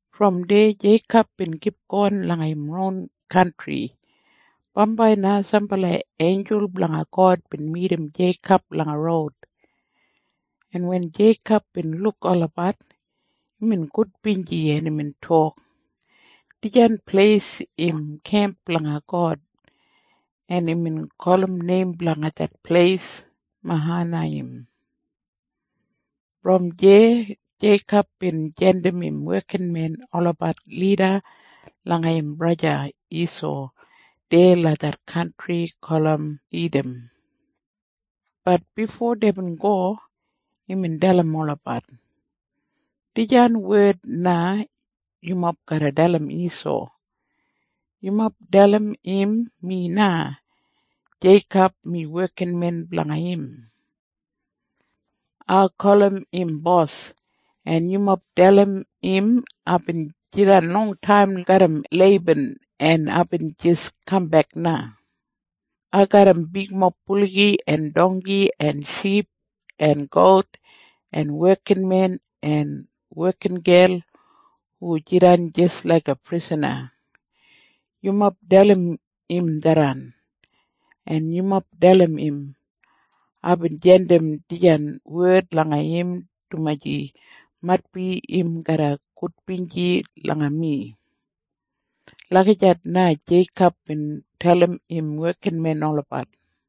Brom deya Jeikob bin kipgon langa im ron kantri. Bambai na sambala einjul blanga God bin midim Jeikob langa roud, en wen Jeikob bin luk olabat, imbin gudbinji, en imbin tok, “Dijan pleis im kemp blanga God!” En imbin gulum neim blanga det pleis Mahanaiyim. Brom deya Jeikob bin jandim im wekinmen olabat lida langa im braja Isau deya langa det kantri gulum Idam. Bat bifo deibin go, imbin dalim olabat, “Dijan wed na yumob garra dalim Isau. Yumob dalim im mi na, Jeikob, mi wekinmen blanga im. Ai gulum im bos. En yumob dalim im aibin jidan longtaim garram Leiban, en aibin jis kambek na. Ai garram bigmob buligi en dongki en ship en gout en wekinmen en wekingel hu jidan jis laiga prisana. Yumob dalim im tharran. En yumob dalim im, aibin jandim dijan wed langa im dumaji maitbi im garra gudbinji langa mi.” Lagijat na Jeikob bin dalim im wekinmen olabat.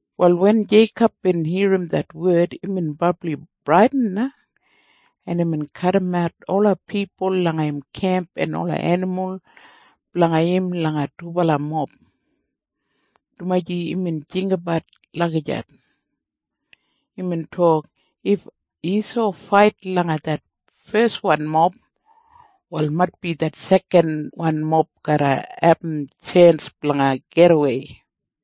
Wal wen Jeikob bin irrim det wed, imbin brabli bradin na, en imbin kadimat ola pipul langa im kemp en ola enimul blanga im langa dubala mob, dumaji imbin jinggabat lagijat. Imbin tok, “If Isau fait langa det feswan mob, wal maitbi det sekanwan mob garra abum tjens blanga gidawei.”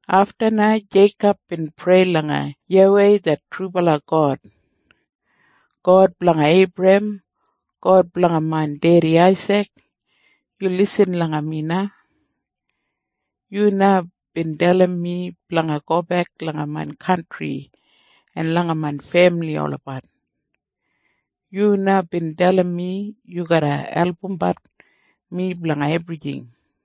Afta na Jeikob bin prei langa YAWEI det trubala God, “God blanga Eibrahem! God blanga main dedi Aisik! Yu lisin langa mi na! Yu na bin dalim mi blanga gobek langa main kantri en langa main femili olabat. Yu na bin dalim mi yu garra albumbat mi blanga ebrijing.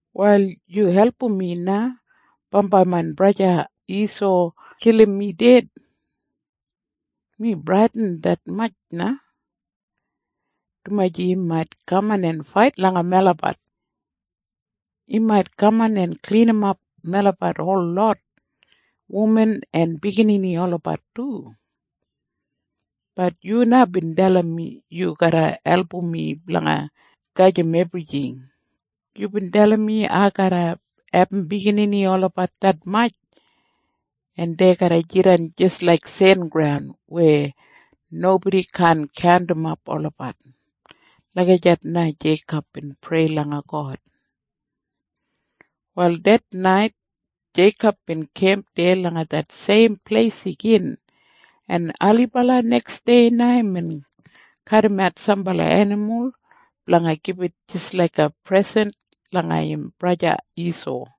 “Wal yu album mi na bambai main braja Isau kilim mi ded. Mi bradin detmatj na, dumaji im mait kaman en fait langa melabat. Im mait kaman en klinimap melabat holot, wuman en biginini olabat du. Bat yu na bin dalim mi yu garra album mi blanga gajim ebrijing. Yubin dalim mi ai garra abum biginini olabat detmatj, en dei garra jidan jis laik sengraun weya nobodi kaan kaundimap olabat.” Lagijat na Jeikob bin prei langa God. Wal det nait Jeikob bin kemp deya langa det seim pleis igin, en ailibala neksdei na imbin kadimat sambala enimul blanga gibit jis laiga presen langa im braja Isau.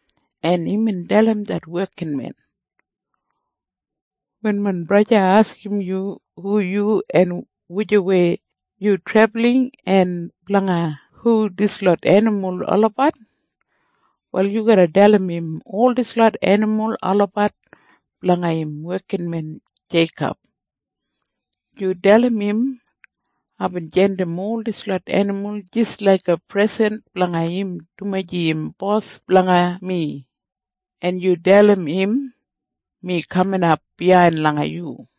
en imbin dalim det wekinmen, “Wen main braja askim yu hu yu en wujawei yu trebulin en blanga hu dislot enimul olabat, wal yu dalim im ol dislot enimul olabat blanga im wekinmen Jeikob. Yu dalim im aibin jandim ol dislot enimul jis laiga presen blanga im dumaji im bos blanga mi. En yu dalim im, mi kaminap biyain langa yu.”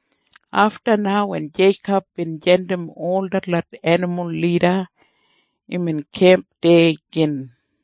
Afta na wen Jeikob bin jandim ol detlot enimul lida, imbin kemp deya gin.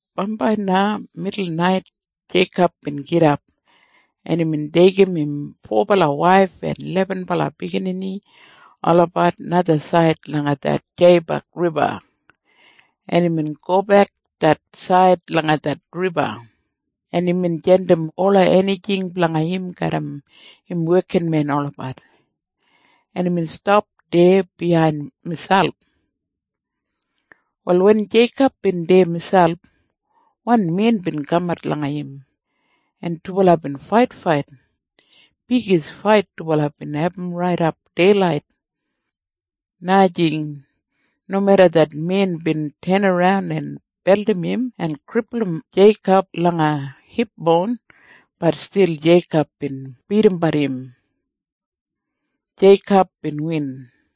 Bambai na midul nait Jeikob bin gidap, en imbin deigim im fobala waif en lebenbala biginini olabat najasaid langa det Jeibak Riba, en imbin gobek det said langa det riba, en imbin jandim ola enijing blanga im garram im wekinmen olabat, en imbin stap deya biyain miselp. Wal wen Jeikob bin deya miselp, wan men bin kamat langa im, en dubala bin faitfait. Bigis fait dubala bin abum raidap deilait. Najing. Nomeda det men bin tenaran en beldim im en kripulum Jeikob langa hipboun, bat stil Jeikob bin bidimbat im. Jeikob bin win.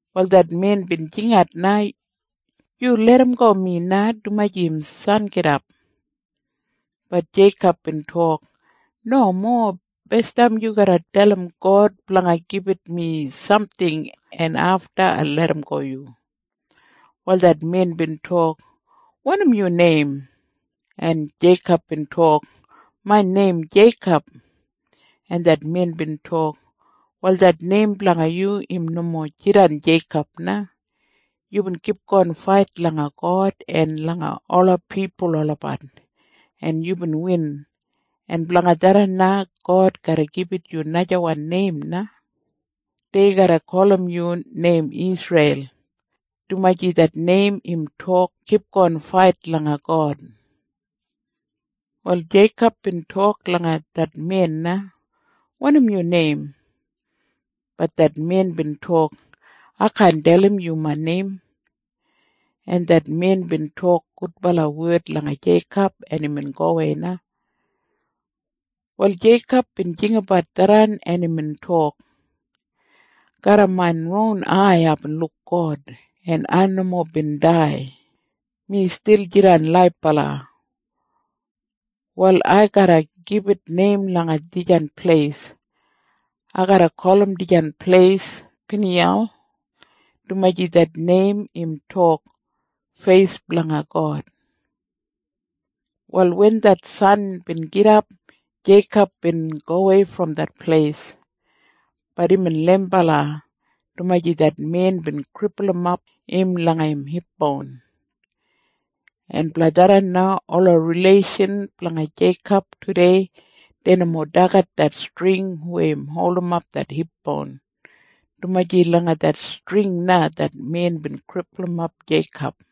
Wal det men bin jingat na, “Yu larramgo mi na, dumaji im sangidap.” Bat Jeikob bin tok, “Nomo. Basdam yu garra dalim God blanga gibit mi samting. En afta ai larramgo yu.” Wal det men bin tok, “Wanim yu neim?” En Jeikob bin tok, “Main neim Jeikob.” En det men bin tok, “Wal det neim blanga yu im nomo jidan Jeikob na. Yubin kipgon fait langa God en langa ola pipul olabat, en yubin win. En blanga tharran na God garra gibit yu najawan neim na. Dei garra gulum yu neim Isreil, dumaji det neim im tok Kipgon Fait Langa God.” Wal Jeikob bin tok langa det men na, “Wanim yu neim?” Bat det men bin tok, “Ai kaan dalim yu main neim.” En det men bin tok gudbala wed langa Jeikob, en imbin gowei na. Wal Jeikob bin jinggabat tharran en imbin tok, “Garram main ron ai aibin luk God, en ai nomo bin dai. Mi stil jidan laibala. Wal ai garra gibit neim langa dijan pleis. Ai garra gulum dijan pleis Piniyal, dumaji det neim im tok Feis Blanga God.” Wal wen det san bin gidap, Jeikob bin gowei brom det pleis. Bat imbin leimbala, dumaji det men bin kripulumap im langa im hipboun. En blanga tharran na ola rileishan blanga Jeikob tudei dei nomo dagat det string weya im holdim det hipboun, dumaji langa det string na det men bin kripulum Jeikob.